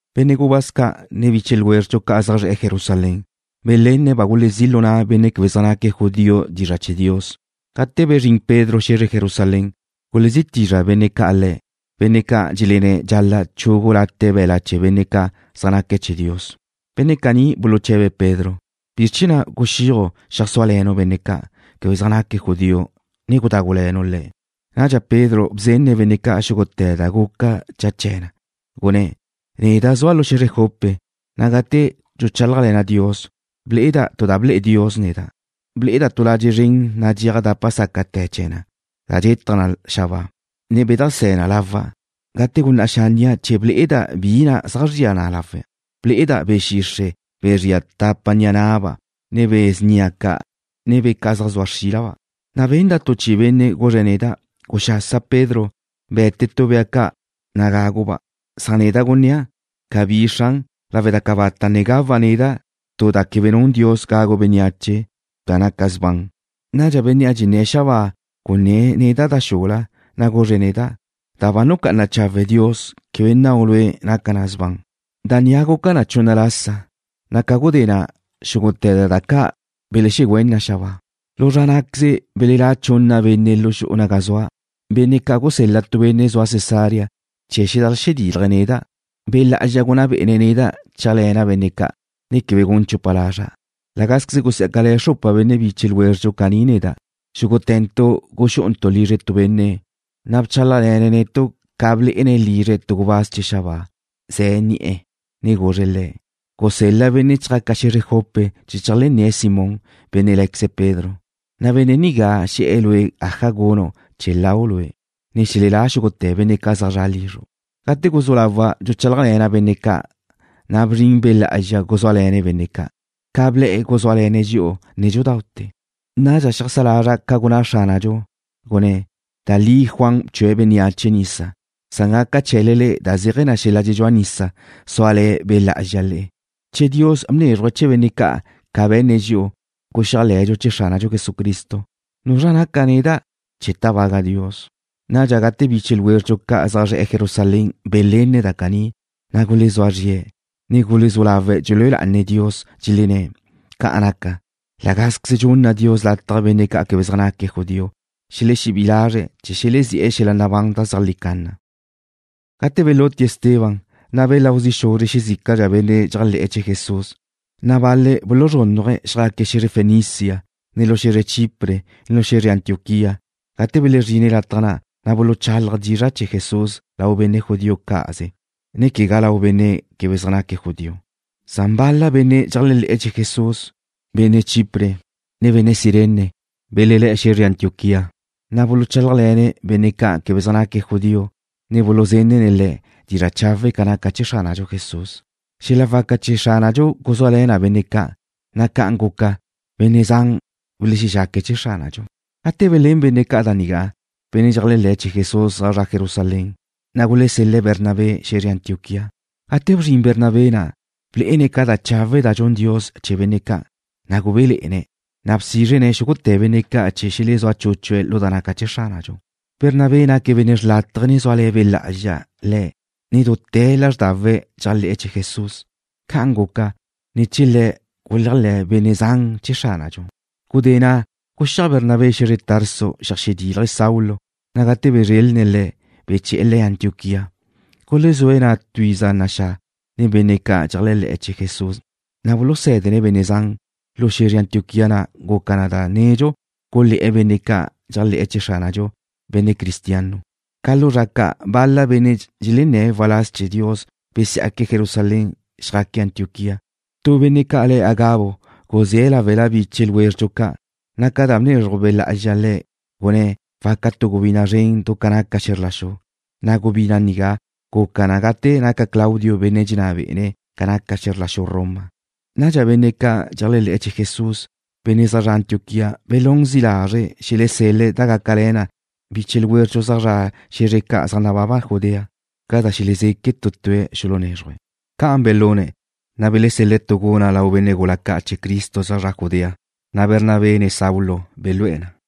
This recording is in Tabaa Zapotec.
Benne' gubáz ca', ne biche ljwézredxu ca' zaj zre̱'e̱ Jerusalén belenne̱' ba gulezí' lu na' benne' quebe zaj naque̱' judío dizra' chee̱ Dios. Gate bezrín Pedro xe̱zre Jerusalén, gulezí' tizra' benne' ca' le̱', benne' ca' dxelenné̱' dxal-la' chugu late' be̱la' chee̱ benne' ca' zaj naque̱' chee̱ Dios. Benne' caní buluche̱be̱' Pedro: ―¿Bizr chee̱ na' guxíaju' xeajsúale̱nu' benne' ca' quebe zaj naque̱' judío, ne gudágule̱nu' le̱'? Nadxa Pedro bzenne̱' benne' ca' xúgute̱ da guca cha chee̱ na, gunné̱': ―Neda' zua' lu xe̱zre Jope, na' gate dxuchálajle̱na' Dios, ble'eda' tu da ble'e Dios neda'. Ble'eda' tu ladxe' zren nadxéaj dápate̱ la'a chee̱ na, da dxetaj na xabáa, ne bedajsé̱ na lawa'. Gate gunná' xánnia' chee̱ ble'eda' bi na' zaj zria na lawe', ble'eda' be̱ xixre', be̱ zria tapa ni'a na'ba', ne be̱ snia ca', ne bea ca' zaj zua xrílaba'. Na' benda' tu chi'i benne' guzre̱' neda': “Guxasa Pedro, be̱te tu bea ca', na' gagu'-ba'.” Neda' gunnéa': Cabí, Xran, lawe' da cabata' ne gawa' neda' tu da quebe nun Dios gagu bénneache, ne quegá da naca sban. Nadxa bénnea' dxenné̱' xabáa gunné̱' neda' da xula, na' guzre̱' neda': “Da ba nucá'ana chawe' Dios, quebe nnau' lue' naca na sban.” Da nigá guca na chunna lasa, na' ca gudé na' xúgute̱ da ca' belexegüén na xabáa. Lu zra ná'queze belelá' chunna benne' lu xu'u naga zua', benne' ca' gusel-la tu benne' zua Cesarea chee̱ zedajlexedilaj neda'. Be' Lá'azxa gunná bé'ene̱' neda' chéajle̱na' benne' ca', ne quebe gun chupa lazra'. La gázqueze gusiá'cale̱ xrupa benne' biche ljwézredxu caní neda'. Xúgute̱ntu' guxú'untu' lizre tu benne'. Le̱' bchálajle̱ne̱' netu' ca blé'ene̱' lizre̱' tu gubáz chee̱ xabáa, ze̱ ni'e̱, ne guzre̱' le̱': “Gusel-la benne' chjaca xe̱zre Jope chee̱ cheajlenné̱' Simón, benne' lé̱queze̱' Pedro. Benne' nigá xe̱'e̱ lue' aja gunu' chee̱ lau' lue', ne xelelá xúgute̱ benne' zaj zre̱'e̱ lizru'.” Gate guzú lawa' dxuchálajle̱na' benne' ca', na' bzrin Be' Lá'azxa guzúale̱ne̱' benne' ca', ca ble̱'e̱ guzúale̱ne̱' dxi'u nédxudaute̱. Nadxa xeajsá lazra' ca gunná Xránadxu, gunné̱': “Da li Juan bchue̱' bénneache nisa, na' gaca chee̱le da zéaje̱ xel-la' dxedxúa nisa, súale̱ Be' Lá'azxa le'e.” Che Dios bnézruje̱' chee̱ benne' ca' ca be̱nne̱' dxi'u, guxéajle̱dxu chee̱ Xránadxu Jesucristo, ¿nuzra naca' neda' chee̱ tábaga' Dios? Nadxa gate biche ljwézredxu ca' zaj zre̱'e̱ Jerusalén belenne̱' da caní, na' gulezúa zrie̱', ne gulezú lawe̱' dxelúe lá'ane̱' Dios, dxelenné̱': ―Ca' naca, la gázqueze dxunna Dios lataj benne' quebe zaj naque̱' judío xelexebí'i lazre̱' chee̱ xelezi'e̱ xel-la' nabán zeajlí canna. Gate belutie̱' Esteban, na' belau zi' xuzre̱' xezícala benne' dxeléajle̱'e̱ chee̱ Jesús, na' bal-le̱' buluzrúnnaje̱', xjaque̱' xe̱zre Fenicia, ne lu xu Chipre, ne xe̱zre Antioquía. Gate belezrine̱' lataj ca', na' buluchálaje̱' dizra' chee̱ Jesús lau benne' judío cá'aze, ne quegá lau benne' quebe zaj naque̱' judío. Nadxa bal-la benne' dxeléajle̱'e̱ chee̱ Jesús, benne' Chipre, ne benne' Cirene, belelé̱'e̱ xe̱zre Antioquía, na' buluchálajle̱ne̱' benne' ca' quebe zaj naque̱' judío, ne buluzenne̱' le̱' dizra' chawe' ca naca chee̱ Xránadxu Jesús. Xel-la' waca chee̱ Xránadxu guzúale̱ na benne' ca', na' ca'an guca, benne' zan belexexaque̱' chee̱ Xránadxu. Gate belén benne' ca' da nigá, benne' dxeléajle̱'e̱ chee̱ Jesús zaj zre̱'e̱ Jerusalén, na' gulesel-le̱' Bernabé xe̱zre Antioquía. Gate bzrin Bernabé na', blé'ene̱' ca da chawe' da dxun Dios chee̱ benne' ca', na' gubéle̱'e̱ne̱'. Na' bsízrene̱' xúgute̱ benne' ca' chee̱ xelezúa chúchue̱' lu da naca chee̱ Xránadxu. Bernabé naque̱' benne' xrlátaje, na' zúale̱ Be' Lá'azxa le̱', ne dute̱ lázrdawe̱' dxéajle̱'e̱ chee̱ Jesús. Ca'an guca, ne̱ chee̱ le̱' guléajle̱ benne' zan chee̱ Xránadxu. Gudé na' guxíaj Bernabé xe̱zre Tarso, zeajxedílaje̱' Saulo, na' gate bezrelne̱' le̱', beche̱'e̱ le̱' Antioquía. Gulezúe̱' na' tu iza naxá' nen benne' ca' dxeléajle̱'e̱ chee̱ Jesús, na' bulusé̱dene̱' benne' zan. Lu xe̱zre Antioquía na' guca na da nedxu gulé̱'e̱ benne' ca' dxeléajle̱'e̱ chee̱ Xránadxu, Benne' Cristiano. Ca lu zra ca', bal-la benne' dxelenné̱' waláz chee̱ Dios besiá'que̱' Jerusalén, xjaque̱' Antioquía. Tu benne' ca' le̱' Agabo guzé̱' láwela biche ljwézredxu ca', na' ca da bnezruj Be' Lá'azxa le̱', gunné̱' waca tu gubina' zren du ca naca xe̱zr la xu, na' gubina' nigá guca na gate naca Claudio benne' dxenná bé'ene̱' ca naca xe̱zr la xu Roma. Nadxa benne' ca' dxeléajle̱'e̱ chee̱ Jesús, benne' zaj zre̱'e̱ Antioquía belún zi' lazre̱' xelesel-le̱' da gácale̱ na biche ljwézredxu zaj zre̱'e̱ xe̱zre ca' zaj nababa Judea, ca da xelezeque̱' tu tue̱' xulunézruje̱'. Ca'an belune̱', na' belesel-le̱' tu guna' lau benne' gula ca' chee̱ Cristo zaj zre̱'e̱ Judea, na' Bernabé ne Saulo belú'e̱ na na'.